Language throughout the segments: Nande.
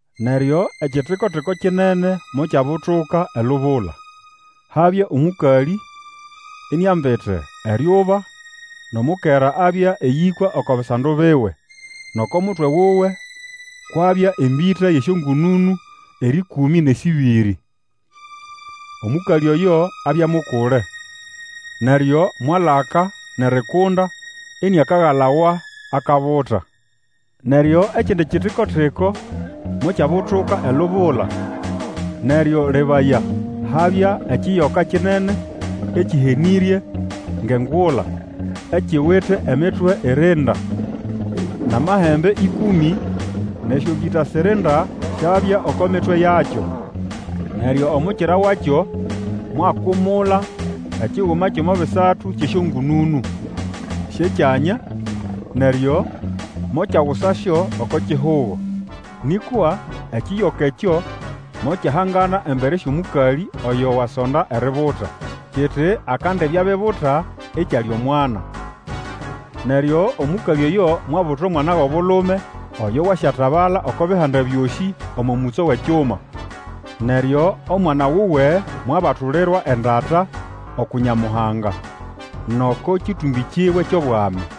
Neryo ekitiko-tiko kinene mokyabutuka elubula. Habya omũkalĩ iniambite eryuba, nʼomukera abya eyĩkwa oko bisando biwe, nʼoko mutwe wuwe kwabya embĩta yʼesyongũnũnũ erĩkũmĩ nʼesĩbĩrĩ. Omũkalĩ oyo abya mukule, neryo mwalaka nʼerikunda iniakagalawa akabuta. Neryo ekindi kitiko-tiko mokyabutuka elubula. Neryo lebaya! Habya ekiyoka kinene ekĩhenĩrye ngʼengula, ikiwite emitwe irinda, nʼamahembe ĩkũmĩ, nʼesyombĩta sirinda syabya oko mitwe yakyo. Neryo omukira wakyo mwakumula ekiguma kyʼomo bisatu kyʼesyongũnũnũ syʼekyanya, neryo mokyagusasyo oko kihugo. Nĩkwa ekiyoka ekyo mokyahangana embere syʼomũkalĩ oyo wasonda eributa, kiti akandibya abibuta, ikyalya omwana. Neryo omũkalĩ oyo mwabuta omwana wʼobulume oyo Wasyatabala oko Bihanda byosĩ omo mũtso wʼekyuma. Neryo omwana wuwe mwabatulirwa endata, uku Nyamuhanga, nʼoko kĩtũmbĩ kiwe kyʼobwami.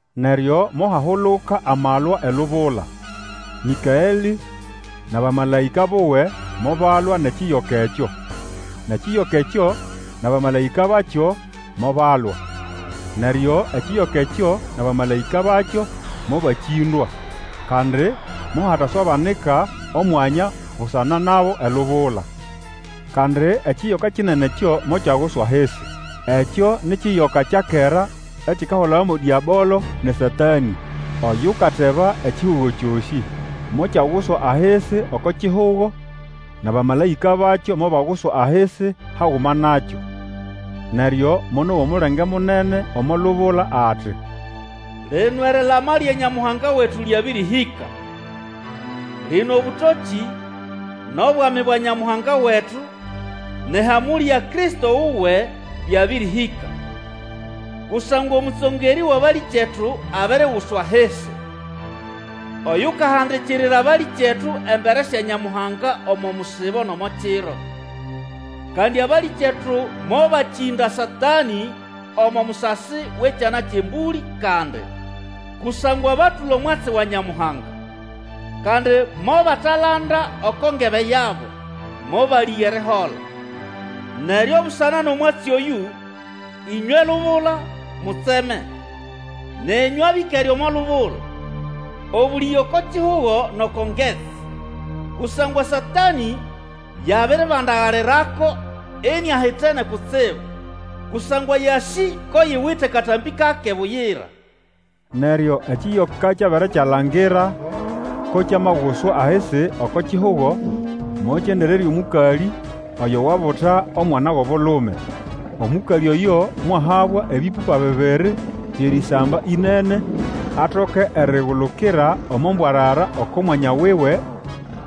Neryo mohahuluka amalwa elubula. Mĩkaelĩ nʼabamalaĩka buwe mobalwa nʼekiyoka ekyo. Nʼekiyoka ekyo nʼabamalaĩka bakyo mobalwa. Neryo ekiyoka ekyo nʼabamalaĩka bakyo mobakĩndwa. Kandi mohataswabanika omwanya busana nabo elubula. Kandi ekiyoka kinene ekyo mokyaguswa ahisi! Ekyo ni kiyoka kya kera ekikahulawa mo Dĩabolo nʼeSatanĩ, oyukateba ekihugo kyosĩ. Mokyaguswa ahisi oko kihugo, nʼabamalaĩka bakyo mobaguswa ahisi haguma nakyo. Neryo monowa omulenge munene omo lubula ati, Lino erilama lya Nyamuhanga wetu lyabĩrĩhĩka! Lino obũtokĩ, nʼobwami bwa Nyamuhanga wetu, nʼehamũlĩ ya Kristo wuwe byabĩrĩhĩka! Kusangwa omũtsongerĩ wʼabalĩkyetu abiriguswa ahisi, Oyukahandikirira abalĩkyetu embere sya Nyamuhanga omo musibo nʼomo kiro. Kandi abalĩkyetu mobakĩnda Satanĩ omo musasi wʼEkyana kyʼembũlĩ kandi, kusangwa batũla omwatsi wa Nyamuhanga. Kandi mobatalanda oko ngebe yabo, mobalĩga erihola. Neryo busana nʼomwatsi oyũ, ĩnywe lubula, mutseme, nenyũ abĩkere omo lubula! Obũlĩge oko kihugo nʼoko ngetsi! Kusangwa Satanĩ yabiribandagalirako iniahitene kutsibu, kusangwa yasĩ ko yiwite katambĩ kake buyira. Neryo ekiyoka kyabere kyalangira ko kyamaguswa ahisi oko kihugo, mokyendererya omũkalĩ oyo wabuta omwana wʼobulume. Omũkalĩ oyo mwahabwa ebĩpũpa bibiri byʼerĩsamba ĩnene, atoke erigulukira omo mbwarara oko mwanya wuwe,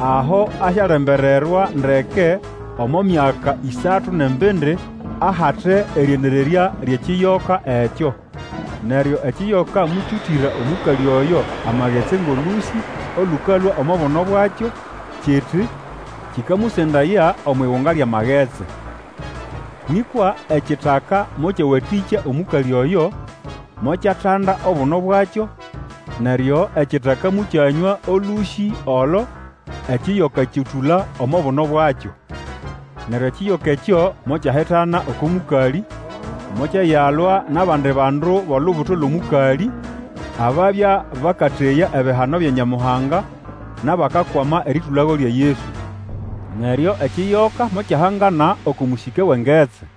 aho asyalembererwa ndeke omo myaka ĩsatu nʼembindi, ahate erĩendererya lyʼekiyoka ekyo. Neryo ekiyoka mokyũtĩra omũkalĩ oyo amagetsi ngʼolũsĩ olũkalũa omo buno bwakyo, kiti kĩkamusendaya omwʼigunga lyʼamagetsi. Nĩkwa ekitaka mokyawatĩkya omũkalĩ oyo, mokyatanda obuno bwakyo, neryo ekitaka mokyanywa olũsĩ olo ekiyoka kyũtũla omo buno bwakyo. Neryo ekiyoka ekyo mokyahitana oko mũkalĩ. Mokyayalwa nʼabandi bandu bʼolubuto lwʼomũkalĩ, ababya bakateya ebihano bya Nyamuhanga nʼabakwama erĩtũlago lya Yesu. Neryo ekiyoka mokyahangana oko mũsĩke wʼengetsi.